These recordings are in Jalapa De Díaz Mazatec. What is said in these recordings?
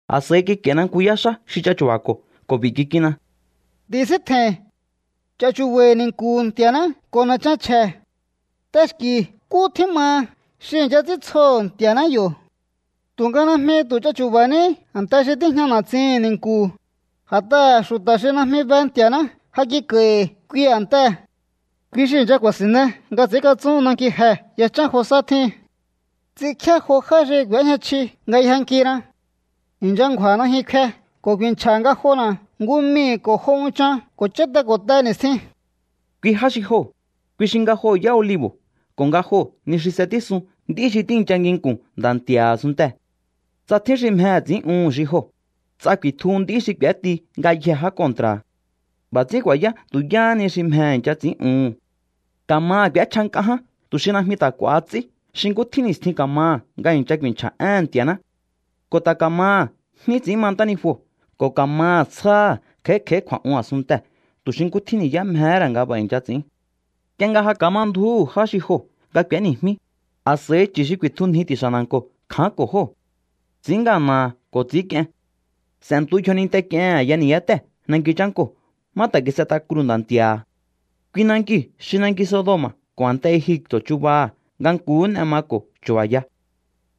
A̱s'a̱i kik'a̱i̱na nku yá xá xi ch'achu̱ba̱ko̱ ko̱ b'i̱ kik'inna: —Ti̱síntje̱i̱n. Ch'a̱chu̱ba̱i̱ ni̱nku̱hu̱ Nti̱a̱ná ko̱ na̱chan chje̱. T'exki̱ nkú tjín maha xi i̱ncha ts'íntsjoho̱ Nti̱a̱ná yo̱. Tu̱nga najmi tu̱ ch'achu̱ba̱ní a̱nte xi tíjña na̱tsihi̱n ni̱nku̱, a̱t'aha̱ xu̱ta̱ xi najmi be Nti̱a̱ná ja kik'a̱i̱hi̱ kui a̱ntee̱. Kui xi i̱ncha ku̱a̱si̱nne nga ts'i̱ínkatsún nanki jee̱ yachán jo sá tjíhin. Ts'inkjíá jo já xi k'u̱éjña chji nga yjankina. I̱ncha ngju̱a̱ najyun kfe ko̱ ku̱i̱nchja̱ ngajona̱ nku mii̱ ko̱ jo unchan ko̱ cháte ko̱ te ni̱stjin. Kui já xi joo̱, kui xi nga joo̱ yá olibo̱ ko̱ nga joo̱ ni xi s'etísun nd'í xi tíi̱ncha nginku̱n Nda̱ Nti̱a̱ha̱ a̱sunntee̱. Tsa tjín xi mjehe̱ ts'i̱ín'uhu̱n xi joo̱, ts'a ku̱i̱tjuhu nd'í xi k'u̱éti ngayjee̱ já kontra̱ha̱. B'a̱ ts'ín ku̱a̱yá tu̱ yáhá ni xi mjehe̱ i̱ncha ts'i̱ín'uhu̱n. Ka̱maha̱ k'u̱échja nk'a ján tu̱ xi najmi ta̱ k'u̱a̱ha ts'í xi nkú tjín ni̱stjin ka̱maha̱ nga i̱ncha ku̱i̱nchja̱ éhe̱n Nti̱a̱ná. Ko̱ ta̱ ka̱maha̱ jní ts'i̱ín ma ntánijuo̱ ko̱ ka̱maha̱ tsjáha̱ kj'a̱í kj'a̱í kju̱a̱'un a̱sunntee̱ tu̱ xi nkú tjín ni̱yá mjehé ra̱ nga b'a̱ i̱ncha ts'i̱ín. Nk'ie nga ja ka̱ma ndju̱úhu̱ já xi joo̱ nga k'u̱éni̱jmí, a̱s'a̱i chu̱ xi ku̱i̱tjunji ti̱xa̱ na̱nko̱ kja̱ánko̱ jóo̱. Ts'i̱ín ngana̱ha̱ ko̱ ts'i̱ínk'ien. S'e̱ntu yjoninte k'iehe̱n a̱ya ni̱yátéhe̱ nanki chánkoo̱ má ta̱ kis'et'a kruu̱ Nda̱ Nti̱a̱ha̱. Kui nankiu̱ xi nanki Sodoma̱ ko̱ a̱nte Egipto̱ chubaha̱ nga nkuhú n'e mako̱ chu̱ba̱ya.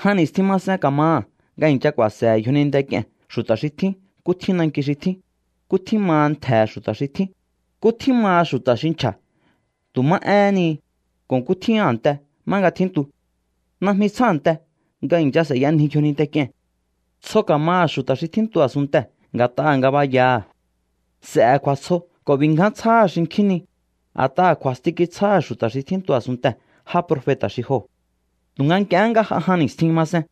Jan ni̱stjin masen ka̱maha̱ nga i̱ncha ku̱a̱se̱he̱ yjoninte k'ie̱n xu̱ta̱ xi tjín nkú tjín nanki xi tjín, nkú tjín maha ntje̱he̱ xu̱ta̱ xi tjín, nkú tjín maha xu̱ta̱ xi nchja̱ tu̱ má éhén ni, ko̱ nkú tjín a̱nte má nga tjíntu. Najmi tsjánte nga i̱ncha s'e̱yanji yjoninte k'ie̱n. Tsjo ka̱maha̱ xu̱ta̱ xi tjíntu a̱sunntee̱ nga̱t'aha̱ ngabayaha̱. S'e̱he̱ kju̱a̱tsjo ko̱ b'i̱ ngján tsjáha̱ xinkjín ni, a̱t'aha̱ kju̱a̱sti kitsjáha̱ xu̱ta̱ xi tjíntu a̱sunntee̱ já profeta̱ xi joo̱. Tu̱nga nk'ie nga j'a jan ni̱stjin masen,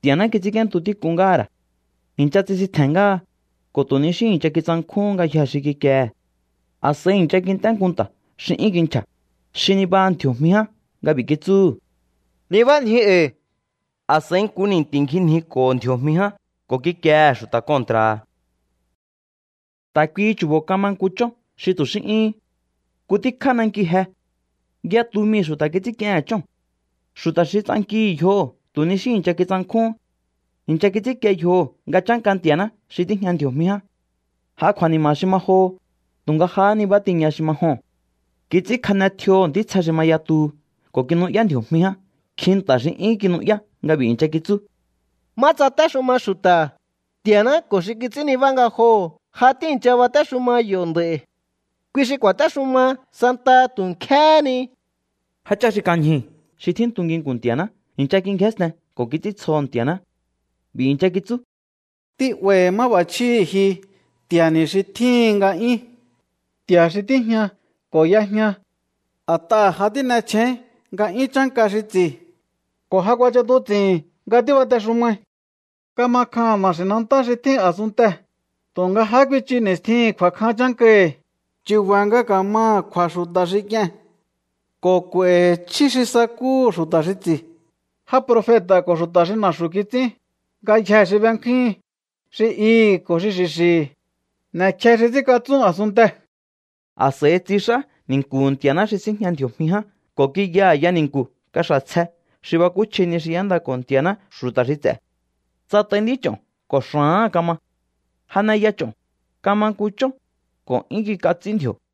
Nti̱a̱ná kits'ínk'íéntu tík'un ngáha̱ ra̱. I̱ncha tsisintje̱n ngáha, ko̱ tu̱ ni xí i̱ncha kitsankjúhún ngayjee̱ xi kikiehe̱. A̱s'a̱i i̱ncha kint'é nku nta̱ xi 'yún kinchja̱, xi nibaha ndji̱o̱jmi ján nga b'i̱ kitsúhu̱: —¡Nibánjiu e̱i̱! A̱s'a̱i nku ni̱nti̱ ngjinjiko̱ho̱ ndji̱o̱jmi ján ko̱ kikiehe̱ xu̱ta̱ kontra̱ha̱. Ta̱ kuihi chu̱bo̱ kama nku chón xi tu̱ xí 'yúhún. Nku tíkjá nankiu̱ je. Yatu mii̱ xu̱ta̱ kits'ínk'iehe̱n chóo̱n. Xu̱ta̱ xi ts'ankihi̱ yjoho̱ tu̱ ni xí i̱ncha kitsankjúhún. I̱ncha kits'ínkie yjoho̱ nga chánka Nti̱a̱ná xi tíjña ndji̱o̱jmi ján. J'a kju̱a̱ni̱ma̱ xi ma joho, tu̱nga jahá nibá tiña xi ma joo̱n. Kits'ínkjane tjioho̱ ntítsje xi ma yatuhu ko̱ kinu'yá ndji̱o̱jmi ján nkjin nta̱ xi 'yún kinu'yá nga b'i̱ i̱ncha kitsú: Má tsatéxuma xu̱ta̱, Nti̱a̱ná ko̱ xi kits'ín nibá ngajoho̱ ja tíi̱ncha batéxuma yo̱ nd'a̱i̱. Kui xi ku̱a̱téxuma santaha tu̱ nkjéhé ni. Jáchá xi kan ñjuu̱ xi tjíntu nginku̱n Nti̱a̱ná i̱ncha kingjénsten ko̱ kits'íntsjoho̱ Nti̱a̱ná. B'i̱ i̱ncha kitsú: Tí'ba̱i̱hi̱ máb'a̱chjíhi̱ ji, Nti̱a̱ni̱ xi tjíhi̱n nga'yún, Nti̱a̱ xi tíjña ko̱ y'ejña. A̱t'aha̱ ja tín'echjéín nga'yún chánka xi ts'i̱, ko̱ ja kuach'atuts'i̱hi̱n nga tíbatexumai. Kama kjaha̱n na̱xi̱nantá xi tjín a̱sunntee̱, tu̱nga jahá kuichu ni̱stjihi̱n kju̱a̱kjan chánkahi̱, chu̱ba̱ nga ka̱maha̱ kju̱a̱ xu̱ta̱ xi k'ie̱n. Ko̱ k'u̱a̱i̱hi̱ chjí xi sakúhu̱ xu̱ta̱ xi ts'i̱, já profeta̱ ko̱ xu̱ta̱ xi na̱xu̱ kits'ín, ngayjee̱ xi bekjúhin, xi ihi̱ ko̱ xi xi̱xi̱hi̱. N'e̱kje xi ts'ínkatsún a̱sunntee̱. A̱s'a̱i tsix'á ni̱nku̱hu̱ Nti̱a̱ná xi síjña ndji̱o̱jmi ján ko̱ kiya a̱ya ni̱nku̱ kaxa̱ tsje xi bakúchji ni xi y'éndako̱ Nti̱a̱ná xu̱ta̱ xi ts'e̱. Tsat'ai nd'ích'o̱n ko̱ xa̱áha̱n kama. Janeya ch'o̱n, kama nku chón, ko̱ 'yún kik'a ts'í ndji̱o̱.